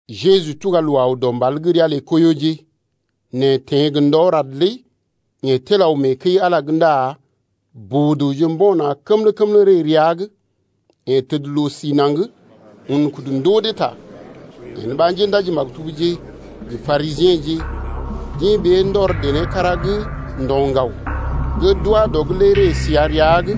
Jeju tuga loo aw dɔ mbal gə́ ria lə Koiyoje. Nɛ teḛ gə ndɔ rad lé yeḛ tel aw mee kəi-Ala’g ndá boo-dəwje mbo̰ na̰ kəmlə-kəmlə ree rəa’g. Yeḛ təd loo si naŋg un kudu ndoo dee ta. Yen ɓa njéndaji-maktubje gə Parisiḛje ndɔr dené kára bèe gə́ deḛ gə diŋgam to gə na̰ lé ree səa rəa’g.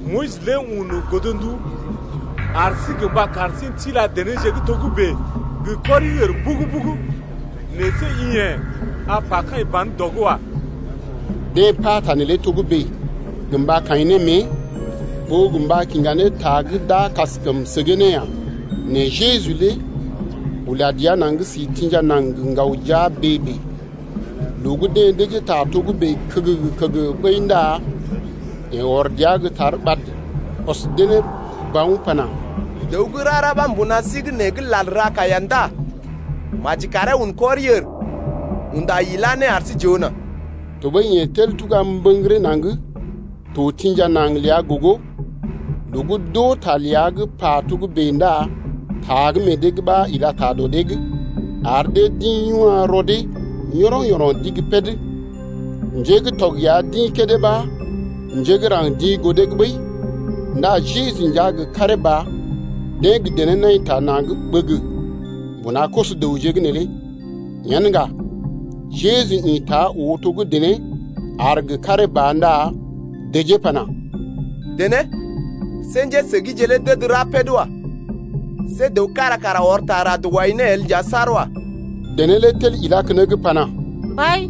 Moyis lé un godndu ar sí gə mba kar sí n’tila denéje gə́ togə́bè lé gə kɔri-ər mbugu-mbugu. Nɛ see i yḛ̀ a pa kaḭ ban dɔ’g wa. Deḛ pata neelé togə́bè gə mba kaḭ ne mée, ɓó gə mba kiŋga ne ta gə́ d’a kaskəm səgee ne ya. Nɛ Jeju lé ula dəa naŋg si tḭja naŋg gə ŋgaw jia bèe-bèe. Loo gə́ deḛ dəjee ta togə́bè kəgəgə-kəgəgə ɓəi ndá yeḛ ɔr dəa gə́ tar ɓad ɔs dee ne bawn pana: Dəw gə́ rara ɓa mbuna sí’g nee gə́ lal ra kaiya ndá maji karee un kɔri-ər unda ilá ne ar sí j’oo nà. Tɔɓəi yeḛ tel ula dəa naŋg to tḭja naŋg ləa gogo. Loo gə́ d’oo ta ləa gə́ pa togə́bè lé ndá ta gə́ meḛ dee’g ɓa ila ta dɔ dee’g, ar dee d’ḭ yuna̰ rɔ dee yɔroŋ-yɔroŋ d’igi kág, njé gə́ tɔg ya d’ḭ kédé ɓa njé gə́ raŋg d’ḭ goo dee’g ɓəi. Ndá Jeju nja gə karee ba deḛ gə dené nai ta na̰’d ɓəgə mbuna koso-dəwje’g neelé. Yen ŋga Jeju ḭta oo to gə́ dené aar gə karee ba ndá dəjee pana: Dené see njésəgije lé d’əd ra kág wa. See dəw kára kara ɔr ta rad wai ne el nja saar wa. Dené lé tel ilá keneŋ pana: Mbai,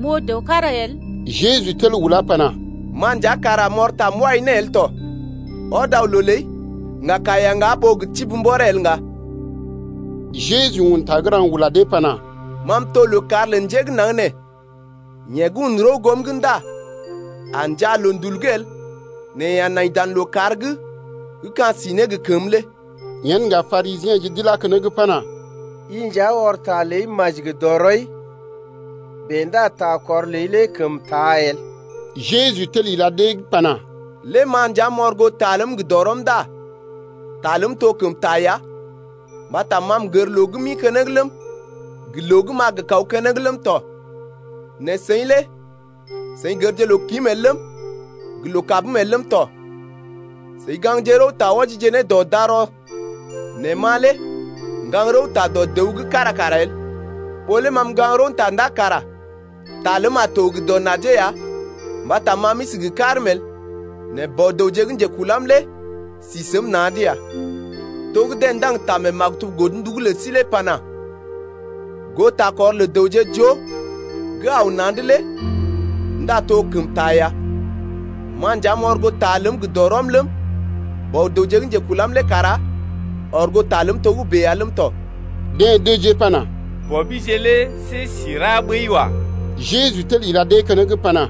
m’oo dəw kára el. Jeju tel ulá pana: Ma nja kara m’ɔr ta m’wai ne el tɔ. Ɔd aw loo ləi, ŋga kaiya ŋgá ɓó gə tibi mbɔree el ŋga Ta neelé godo mee maktubje gə́ ləw gə́ na̰je’g.. Jeju un ta gə́ raŋg ula dee pana: Ma m’to lookàr lə njé gə́ naŋg nee. Yeḛ gə́ un rəw goom’g ndá a njaa loondul’g el nɛ yeḛ a nai dan lookàr’g gə́ ka̰ si ne gə kəmə lé. Yen ŋga Parisiḛje d’ilá keneŋ pana: I nja ɔr ta ləa maji gə dɔrɔi. Bèe ndá ta kɔr ləi lé kəm taa el. Jeju tel ila dee’g pana: Lé ma nja m’ɔr goo ta ləm gə dɔrɔm ndá ta ləm tɔ kəm taa ya, mbata ma m’gər loo gə́ m’ḭ keneŋ ləm, gə loo gə́ m’a gə kaw keneŋ ləm tɔ. Nɛ seḭ lé seḭ gərje loo-kim el ləm, gə loo-kabm el ləm tɔ. Seḭ gaŋgje rəwta wɔjije ne dɔ darɔ nɛ ma lé m’gaŋg rəwta dɔ dəw gə́ kára kara el. Ɓó lé ma m’gaŋg rəwta ndá kara ta ləm a to gə dɔ najee ya mbata ma m’isi gə karm el, nɛ Bɔ-dəwje gə́ njekulam lé si səm na̰’d ya. To gə́ deḛ ndaŋg ta mee maktub godndu’g lə sí lé pana: Goo takɔr lə dəwje joo gə́ aw na̰’d lé ndá to kəm taa ya. Ma nja m’ɔr goo ta ləm gə dɔrɔm ləm, Bɔ-dəwje gə́ njekulam lé kara ɔr goo ta ləm tɔgəbè ya ləm tɔ. Deḛ dəjee pana: Bɔbije lé see si ra ɓəi wa. Jeju tel ila dee keneŋ pana: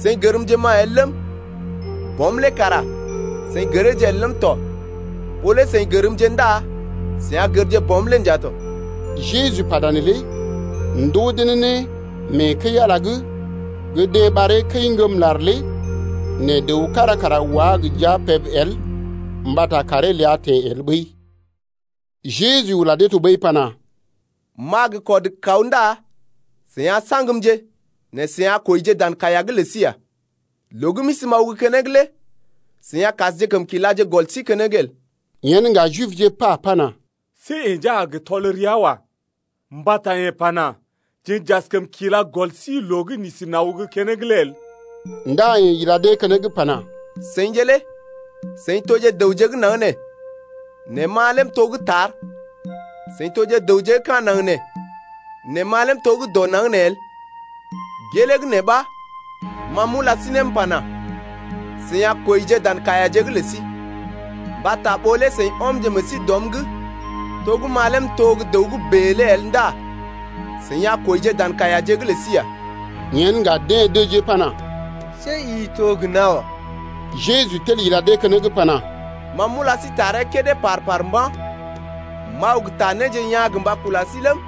Seḭ gərmje ma el ləm, Bɔm lé kara seḭ gəreeje el ləm tɔ. Ɓó lé seḭ gərmje ndá seḭ a gərje Bɔm lé nja tɔ. Jeju pata neelé ndoo dee ne mee kəi-Ala’g gə́ deḛ ɓaree kəi-ŋgəm-lar lé, nɛ dəw kára kara wá gə jia peb el mbata kàree ləa teḛ el ɓəi. Jeju ula dee tɔɓəi pana: M’a gə kɔd kaw ndá seḭ a saŋgmje nɛ seḭ a kwəije dan kaiya’g lə sí ya. Loo gə́ m’isi m’aw gə́ keneŋ lé seḭ a kasjekəm kilaje gɔl sí keneŋ el. Yen ŋga Jibje pa pana: See yeḛ nja a gə tɔl rəa wa. Mbata yeḛ pana: Jeḛ j’askəm kila gɔl sí loo gə́ n’isi n’aw gə́ keneŋ lé el. Ndá yeḛ ila dee keneŋ pana: Seḭje lé seḭ toje dəwje gə́ naŋg nee, nɛ ma lé m’to gə́ tar. Seḭ toje dəwje gə́ ka̰ naŋg nee, nɛ ma lé m’to gə́ dɔ naŋg nee el. Gelee gə́ nee ɓa ma m’ula sí ne m’pana: Seḭ a kwəije dan kaiyaje’g lə sí. Mbata ɓó lé seḭ ɔmje meḛ sí dɔm’g to gə́ ma lé m’to gə́ dəw gə́ bèe lé el ndá seḭ a kwəije dan kaiyaje’g lə sí ya. Yen ŋga deḛ dəjee pana: See i to gə́ nawa. Jeju tel ila dee keneŋ pana: Ma m’ula sí taree kédé par-par mba̰. M’aw gə ta néje yaa̰ gə mba kula sí ləm,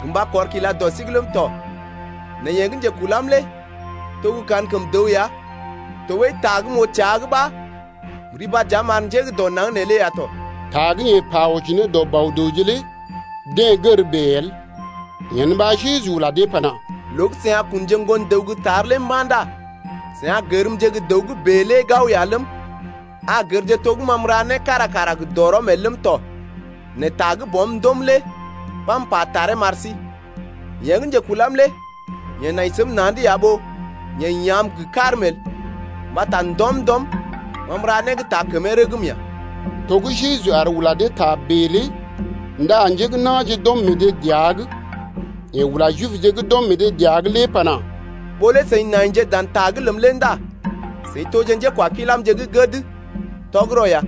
gə mba kɔr kila dɔ sí’g ləm tɔ. Nɛ yeḛ gə́ njekulam lé to gə́ kankəm dəw ya tɔɓəi ta gə́ m’oo təa’g ɓa m’riba dəa m’ar njé gə́ dɔ naŋg neelé ya tɔ. Ta gə́ yeḛ pa wɔji ne dɔ Bɔ-dəwje lé deḛ gər bèe el. Yen ɓa Jeju ula dee pana: Loo gə́ seḭ a kunje Ŋgon-dəw gə́ tar lé mba̰ ndá seḭ a gərmje gə́ dəw gə́ bèe lé gao ya ləm, a gərje to gə́ ma m’ra né kára kara gə dɔrɔm el ləm tɔ, nɛ ta gə́ Bɔm ndoom lé ɓa m’pa taree m’ar sí. Yeḛ gə́ njekulam lé yeḛ nai səm na̰’d ya ɓó yeḛ ya̰’m gə karm el, mbata ndɔm-ndɔm ma m’ra né gə́ taa kəmee rəgm ya. To gə́ Jeju aar ula dee ta bèe lé ndá njé gə́ na̰je d’ɔm meḛ dee dəa’g. Yeḛ ula Jibje gə́ d’ɔm meḛ dee dəa’g lé pana: Ɓó lé seḭ naije dan ta’g ləm lé ndá seḭ toje njékwakilamje gə́ gəd tɔgərɔ ya.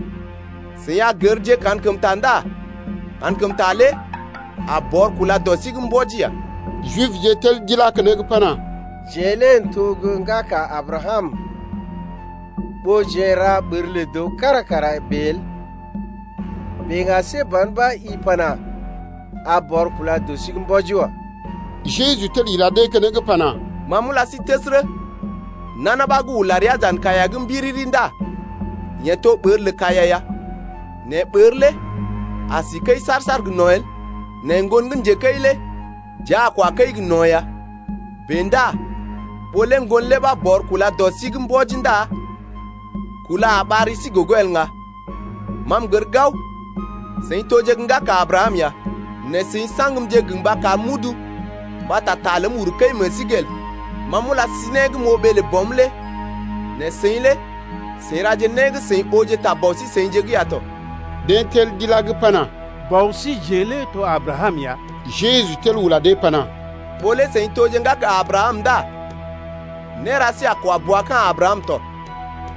Seḭ a gərje kankəmta ndá kankəmta lé a bɔr kúla dɔ sí’g mbɔji ya. Jibje tel d’ilá keneŋ pana: Jeḛ lé n’toje gə́ ŋgaka Abrakam’g ɓó jeḛ n’ra ɓər lə dəw kára kara bèe el. Bèe ŋga see ban ɓa i pana: A bɔr kúla dɔ sí’g mbɔji wa. Jeju tel ila dee keneŋ pana: Ma m’ula sí təsərə, nana ɓa gə́ ula rəa dan kaiya’g mbiriri ndá yeḛ to ɓər lə kaiya ya. Nɛ ɓər lé a si kəi saar-saar gə no̰ el, nɛ ŋgon gə́ njekəi lé dəa a kwa kəi gə no̰ ya. Bèe ndá ɓó lé Ŋgon lé ɓa bɔr kúla dɔ sí’g mbɔji ndá kúla a ɓar ri sí gogo el ŋga. Ma m’gər gao seḭ toje gə́ ŋgaka Abrakam ya, nɛ seḭ saŋgmje gə mba karm m’udu mbata ta ləm uru kəi meḛ sí’g el. Ma m’ula sí né gə́ m’oo ɓee lə Bɔm lé nɛ seḭ lé seḭ raje né gə́ seḭ ooje ta bɔ sí-seḭje’g ya tɔ. Deḛ tel d’ilá’g pana: Bɔ síjeḛ lé to Abrakam ya. Jeju tel ula dee pana: Ɓó lé seḭ toje ŋgaka Abrakam ndá néra sí a kwa bua ka̰ Abrakam tɔ.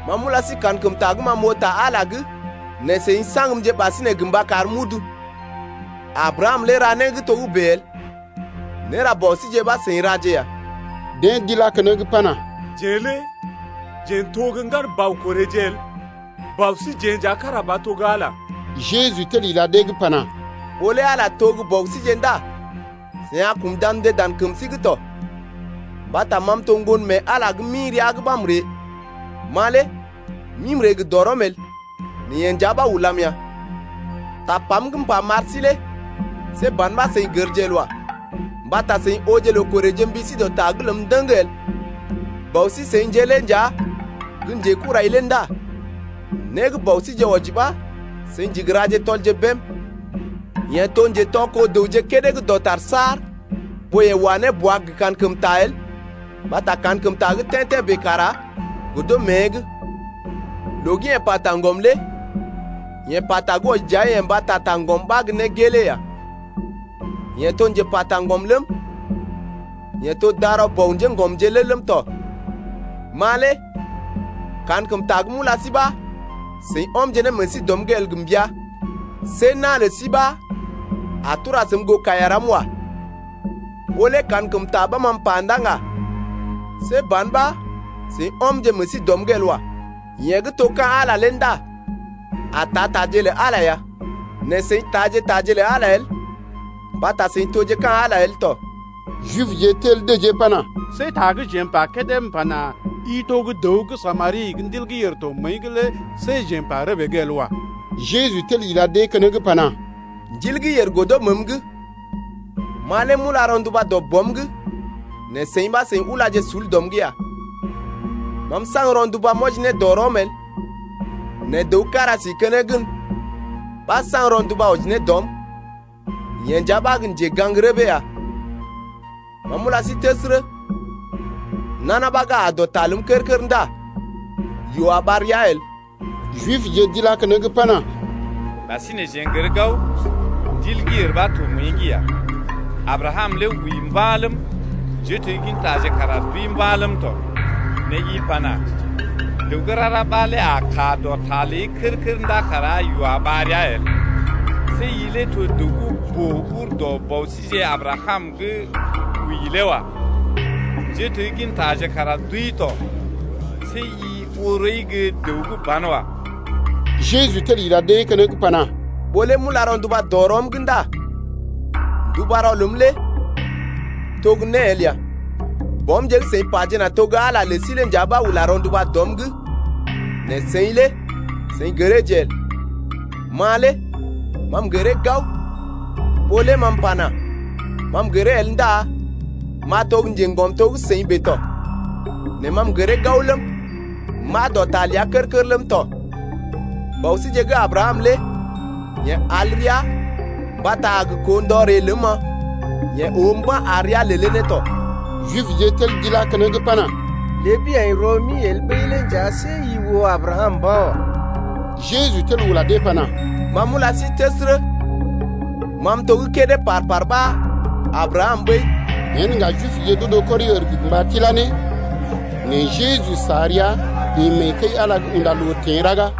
Ma m’ula sí kankəmta gə́ ma m’oo ta Ala’g lé nɛ seḭ saŋgmje ɓasinè gə mba karm m’udu. Abrakam lé ra né gə́ togə́bè el. Néra bɔ síje ɓa seḭ raje ya. Deḛ d’ilá keneŋ pana: Jeḛ lé jeḛ n’to gə́ ŋgan bɔ korèje el, bɔ síjeḛ nja kára ba to gə́ Ala ya. Jeju tel ila dee’g pana: Ɓó lé Ala to gə́ Bɔ síje ndá seḭ a kṵdamje dan kəm sí’g tɔ, mbata ma m’to Ŋgon mee Ala gə́ m’ḭ rəa’g ɓa m’ree. Ma lé m’ḭ m’ree gə dɔrɔm el, nɛ yeḛ nja ɓa ulam ya. Tapam gə́ m’pa m’ar sí lé see ban ɓa seḭ gərje el wa. Mbata seḭ ooje loo korèje mbi sí dɔ ta’g ləm ndəŋ el. Bausi-seḭje lé nja gə́ njekurai lé ndá né gə́ bɔ síje wɔji ɓa seḭ ndigi raje tɔlje bém. Yeḛ to njetɔ-kó-dəwje kédé gə́ dɔtar saar ɓó yeḛ wa ne bua gə kankəmta el mbata kankəmta gə́ tḛ́-tḛ́ bèe kara godo mée’g. Loo gə́ yeḛ pa taŋgɔm lé yeḛ pata gə́ wɔji dəa-yeḛ mbata taŋgɔm ɓa gə́ né gelee ya. Yeḛ to njepa taŋgɔm ləm, yeḛ to darɔ bɔ njéŋgɔmje lé ləm tɔ. Ma lé kankəmta gə́ m’ula sí ɓa seḭ ɔmje ne meḛ sí dɔm’g el gə mbəa. See na̰ lə sí ɓa a tura səm goo kaiya ram wa. Ɓó lé kankəmta ɓa ma m’pa ndá ŋga, see ban ɓa seḭ ɔmje meḛ sí dɔm’g el wa. Yeḛ gə́ to ka̰ Ala lé ndá a taa taje lə Ala ya. Nɛ seḭ taaje taje lə Ala el mbata seḭ toje ka̰ Ala el tɔ. Jibje tel dəjee pana: See ta gə́ jeḛ m’pa kédé m’pana: I to gə́ dəw gə́ Samari gə́ ndil gə́ yèr to məəi’g lé see jeḛ m’pa rəbee’g el wa. Jeju tel ila dee keneŋ pana: Ndil gə́ yèr godo məəm’g, ma lé m’ula rɔnduba dɔ Bɔm’g nɛ seḭ ɓa seḭ ulaje sul dɔm’g ya. Ma m’saŋg rɔnduba m’wɔji ne dɔ rɔm el, nɛ dəw kára si keneŋ gən ɓa saŋg rɔnduba wɔji ne dɔm, yeḛ nja ɓa gə́ njegaŋ-rəbee ya. Ma m’ula sí təsərə, nana ɓa gə́ aa dɔ ta ləm kər-kər ndá yoo a ɓar ria el. Jibje d’ilá keneŋ pana: Ɓasinè jeḛ n’gər gao, ndil gə́ yèr ɓa to məəi’g ya. Abrakam lé wəi mba̰ ləm, njéteggintaje kara d’wəi mba̰ ləm tɔ. Nɛ i pana: Dəw gə́ rara ɓa lé a kaa dɔ ta ləi kər-kər ndá kara yoo a ɓar ria el. See i lé to dəw gə́ boo ur dɔ bɔ síje Abrakam gə́ wəi lé wa. Njéteggintaje kara d’wəi tɔ. See i oo rɔi gə́ dəw gə́ banwa. Jeju tel ila dee keneŋ pana: Ɓó lé m’ula rɔnduba dɔ rɔm’g ndá ndubarɔ ləm lé to gə́ né el ya. Baumje gə́ seḭ pajena to gə́ Ala lə sí lé nja ɓa ula rɔnduba dɔm’g, nɛ seḭ lé seḭ gəreeje el. Ma lé ma m’gəree gao, ɓó lé ma m’pana: Ma m’gəree el ndá m’a to gə́ njeŋgɔm to gə́ seḭ bèe tɔ. Nɛ ma m’gəree gao ləm, m’aa dɔ ta ləa kər-kər ləm tɔ. Bɔ síje gə́ Abrakam lé yeḛ al rəa mbata a gə koo ndɔ ree ləm-ma, yeḛ oo mba̰ ar rəa lelee ne tɔ. Jibje tel d’ilá keneŋ pana: Ləbi aḭ rɔ-mi el ɓəi lé nja see i oo Abrakam mba̰ wa. Jeju tel ula dee pana: Ma m’ula sí təsərə, ma m’to gə́ kédé par-par ɓa Abrakam ɓəi. Yen ŋga Jibje d’odo kɔri-ər gə mba tilá ne. Nɛ Jeju sa rəa ḭ mee kəi-Ala’g unda loo teḛ raga.